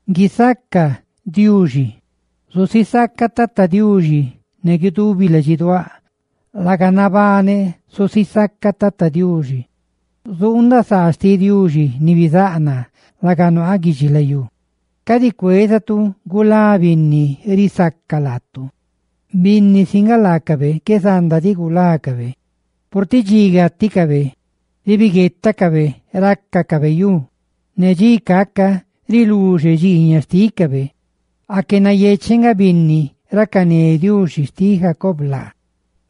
¡Guisaca Diuxi! Zusisacaꞌ Tata Diuxi ne guidubi ladxiduáꞌ. Laga nabaneꞌ zusisacaꞌ Tata Diuxi; zuundaꞌ saa xtiꞌ Diuxi ni bizáꞌ naa laga nuaaꞌ guidxilayú. Cadi cuézatu gulá binni risaca laatu, binni si nga laacabe qué zanda diꞌ gulácabe, purtiꞌ dxi gáticabe ribiguetaꞌ rácacabe yu, ne dxi caca riluxe dxiiñaꞌ xtícabe. Aque nayecheꞌ nga binni racané Diuxi xtiꞌ Jacob laa,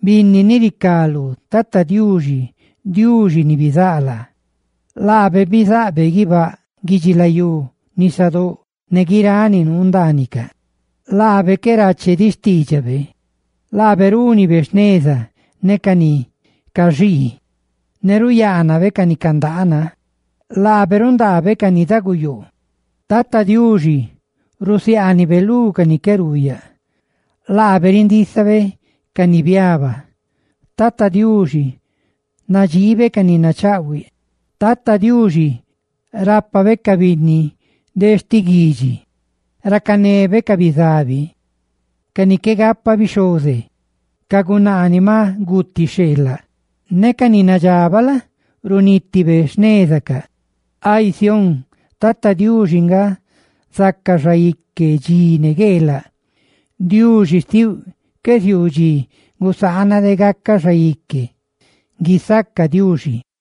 binni ni ricá lú Tata Diuxi, Diuxi ni bizáꞌ laa. Laabe bizaꞌbe guibáꞌ, guidxilayú, nisadóꞌ, ne guiráꞌ ni nuu ndaanicaꞌ. Laabe qué rache diꞌ xtiidxabe. Laabe rúnibe jneza ne ca ni caxii, ne ruyaanabe ca ni candaana. Tata Diuxi rundaa ca ni daguyoo; Tata Diuxi rusiaanibe lú ni qué ruuyaꞌ; Tata Diuxi rindisaꞌ ca ni maꞌ biaba; Tata Diuxi nadxii ca ni nachaꞌhuiꞌ; Tata Diuxi rapa ca binni de sti guidxi, ne racané ca bizabi ne ca gunaa ni maꞌ guti xheelaꞌ, ne ca ni nadxabaꞌ la? runítibe xnezacaꞌ. Ay Sión, Tata Diuxi nga zaca xaique dxi ne gueelaꞌ; Diuxi xtiuꞌ qué ziuu dxi gusaana de gacaꞌ xaique. ¡Guisaca Diuxi!